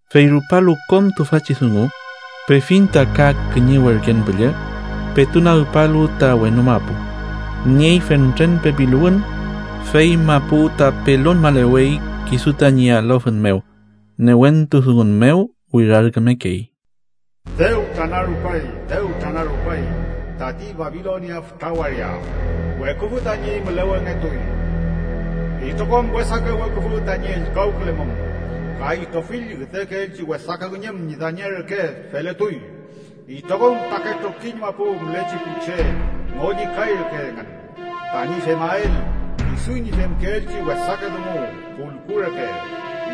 Fey rupalu kom tüfachi dungu, pefiñ ta ka kiñe werken püllü petu nagpalu ta wenu mapu. Niey fentren pepiluwün, fey mapu ta pelonmalewey kisu tañi alofün mew. Newentu dungun mew wirarkümekey: “¡Dew tranarupay, dew tranarupay tati Babilonia fütra waria! ¡Weküfü tañi mülewengetuy! Itrokom wesake weküfü tañi ellkawkülemum. ¡Ka itrofill üdekeelchi wesake üñüm ñi dañe reke feletuy! Itrokom fütrake trokiñ mapu mülechi pu che ngollikay reke engün, tañi femael kisu ñi femkeelchi wesake dungu pulku reke.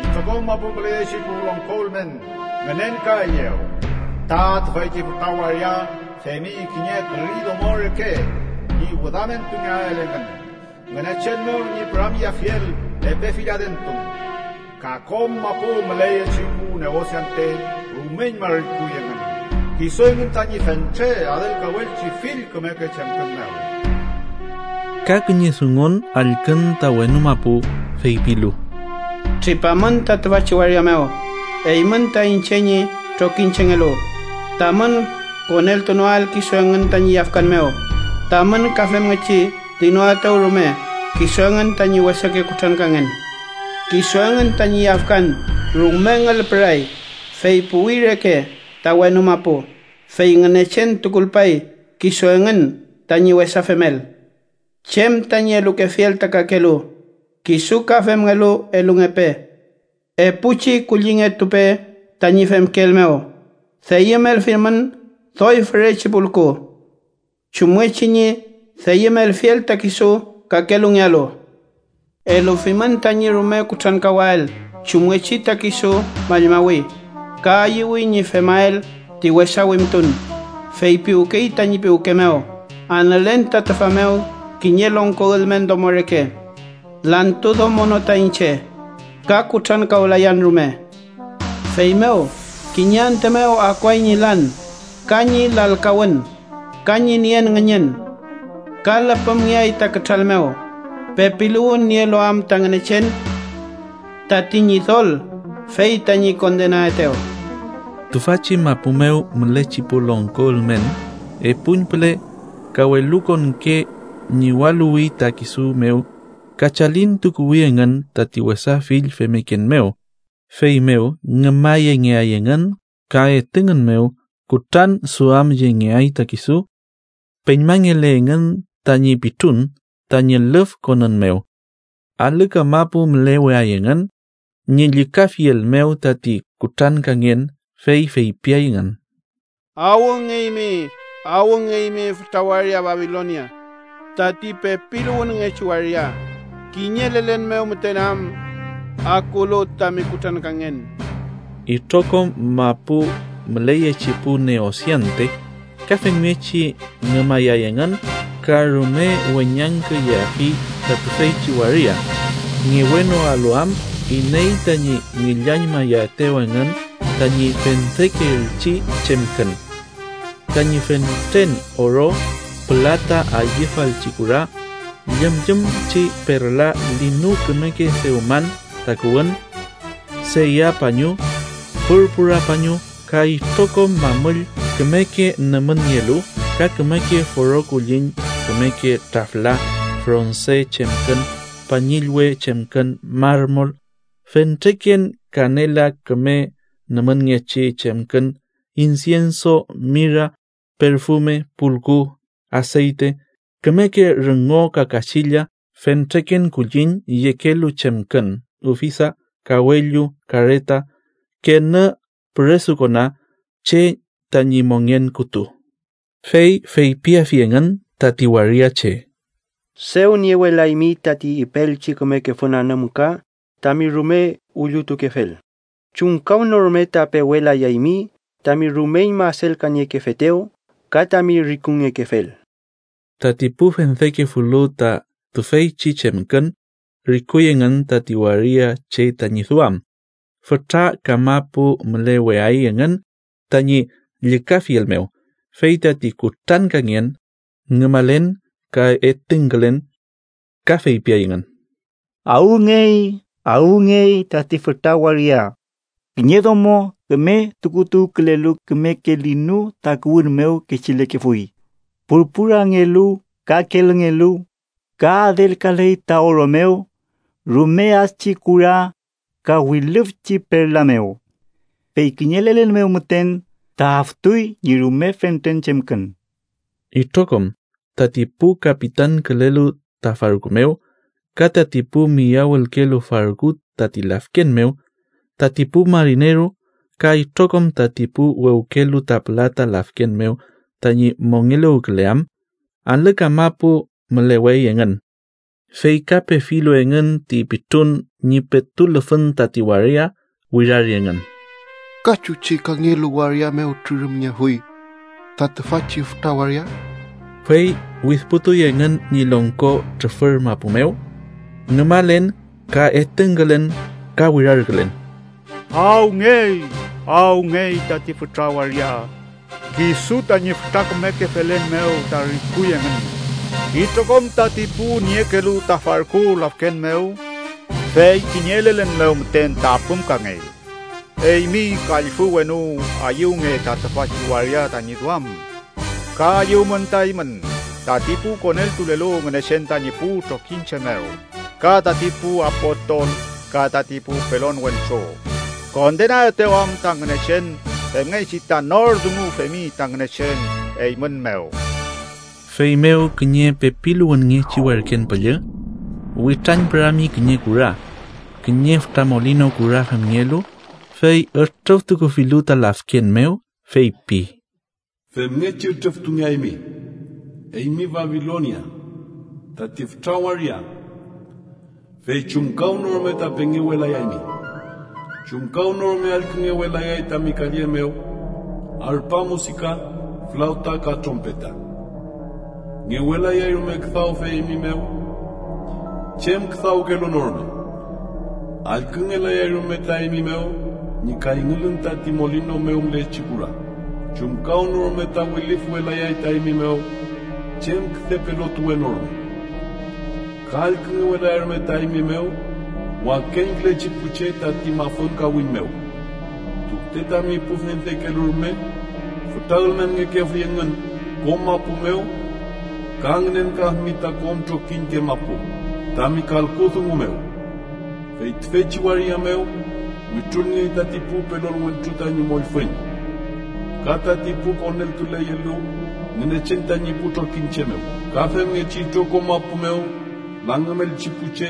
Itrokom mapu müleyechi pu longko ülmen ngünenkaeyew ta tüfeychi fütra waria femi kiñe küri domo reke ñi wüdamentungeael engün Ngünechen mew ñi püramyeafiel epe fill adentun. Ka kom mapu müleyechi pu neosiante rumeñma rikuy engün kisu engün tañi fentre adelkawelchi fill kümeke chemkün mew.” Ka kiñe dungun allkün ta wenu mapu, feypilu: “Tripamün ta tüfachi waria mew, eymün ta iñche ñi trokiñchengelu, tamün koneltunoael kisu engün tañi yafkan mew tamün ka femngechi dinoaetew rume kisu engün tañi wesake kutrankangen: Kisu engün tañi yafkan rume ngülpüray, fey puwi reke ta wenu mapu, fey Ngünechen tukulpay kisu engün tañi wesa femel. Chem tañi elukefiel ta kakelu, kisu ka femngelu elungepe. Epuchi kullingetupe tañi femkeel mew. Deyümelfimün doy fürechi pulku chumngechi ñi deyümelfiel ta kisu kakelungealu. Elufimün tañi rume kutrankawael chumngechi ta kisu mallmawi ka ayüwi ñi femael ti wesa wimtun. Feypiwkey tañi piwke mew: ‘Anülen ta tüfa mew kiñe longko ülmen domo reke. Lantu domo no ta iñche, ka kutrankawlayan rume.’ Feymew, kiñe antü mew akuay ñi lan ka ñi lalkawün ka ñi nien ngüñün, ka lüpümngeay ta kütral mew, pepiluwün nielu am ta Ngünechen, tati Ñidol fey tañi kondenaetew. “Tüfachi mapu mew mülechi pu longko ülmen epuñpüle ka welukonke ñiwaluwi ta kisu mew ka chalintukuwi engün tati wesa fill femmeken mew, feymew ngümayengeay engün ka etüngün mew kutranduamyengeay ta kisu. Peñmanagle engün tañi pitrun tañi lüfkonün mew. Alü kamapu müleweay engün ñi llükafiel mew tati kutrankangen, fey feypiay engün: “ ‘¡Awngeymi, awngeymi, fütra waria, Babilonia, tati pepiluwünngechi waria! ¡Kiñe lelen mew müten am akulu tami kutrankangen!’ “Itrokom mapu müleyechi pu neosiante ka femngechi ngümayay engün ka rume weñangküyeafi ta tüfeychi waria, ngewenoalu am iney tañi ngillañmayaetew engün tañi fendekeelchi chemkün: tañi fentren oro, pülata, ayüfalchi kura, llümllümchi perla, linu kümeke dewman takuwün, seya pañu, purpura pañu, ka itrokom mamüll kümeke nümünngelu, ka kümeke foro kulliñ, kümeke trafla, fronse chemkün, pañillwe chemkün, marmol, fentreken kanela, küme nümünngechi chemkün, insienso, mira, perfume, pulku, aseyte, kümeke rüngo ka kachilla, fentreken kulliñ yekelu chemkün, ufisa, kawellu, kareta, kenü püresukona, che tañi mongen kütu. “Fey feypiafi engün tati waria che: ‘Dew niewelaymi tati ipeelchi kümeke fün anümka tami rume illutukefel. Chumkawnorume ta pewetulayaymi tami rumeñma adelkaniekefetew ka tami rikungekefel.’ Tati pu fendekefulu ta tüfeychi chemkün rikuy engün tati waria che tañi duam, fütra kamapu müleweay engün tañi llükafiel mew, fey tati kutrankangen, ngümalen ka etüngkülen. Ka feypiay engün: “ ‘¡Awngey, awngey tati fütra waria! Kiñe domo küme tukutuwkülelu kümeke linu takuwün mew kechilekefuy, purpurangelu ka kelüngelu, ka adelkaley ta oro mew, rume adchi kura ka wilüfchi perla mew ¡Fey kiñe lelen mew müten ta aftuy ñi rume fentren chemkün!’ “Itrokom tati pu kapitankülelu ta farku mew ka tati pu miyawülkelu farku tati lafken mew, tati pu marineru ka itrokom tati pu wewkelu ta pülata lafken mew tañi mongeluwküleam, alü kamapu mülewey engün. Fey ka, pefilu engün ti pitrun ñi petu lüfün tati wirari engün: “ ‘¿Ka chuchi kangelu waria mew trürümngeafuy ta tüfachi fütra waria?’ Fey widpütuy engün ñi longko trufür mapu mew, ngümalen ka etüngkülen ka wirarkülen: ‘¡Awngey, awngey tati fütra waria! Kisu tañi fütra kümeke felen mew ta rikuy engün itrokom tati pu niekelu ta farku lafken mew. ¡Fey kiñe lelen mew müten ta apümkangey! Eymi, kallfü wenu, ayüwnge ta tüfachi waria tañi duam. Ka ayüwmün ta eymün, tati pu koneltulelu Ngünechen tañi pu trokiñche mew ka tati pu apostol ka tati pu pelon wentru, kondenaetew am ta Ngünechen femngechi ta nor dungu femi ta Ngünechen eymün mew.’” Feymew kiñe pepiluwünngechi werken püllü witrañpürami kiñe kura, kiñe fütra molinu kura femngelu, fey ütrüftukufilu ta lafken mew, feypi: “Femngechi ütrüftukungeaymi, eymi Babilonia, tati fütra waria, fey chumkawnorume ta pengewelayaymi. Chumkawnorume allküngewelayay tami kalle mew arpa musika, flawta ka trompeta. Ngewelayay rume küdawfe eymi mew chem küdawkelu no rume, allküngelayay rume ta eymi mew ñi kayngülün tati molinu mew mülechi kura. Chumkawnorume ta wilüfwelayay ta eymi mew chem küde pelontuwe no rume, ka allküngewelayay rume ta eymi mew wakeñkülechi pu che tati mafün kawiñ mew, tunte tami pu fendekelu rume fütra ülmenngekefuy engün kom mapu mew ka ngünenkafimi ta kom trokiñke mapu tami kalku dungu mew. Fey tüfeychi waria mew wütrulngey tati pu pelon wentru tañi mollfüñ ka tati pu koneltuleyelu Ngünechen tañi pu trokiñche mew, ka femngechi itrokom mapu mew langümelchi pu che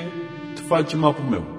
tüfachi mapu mew.”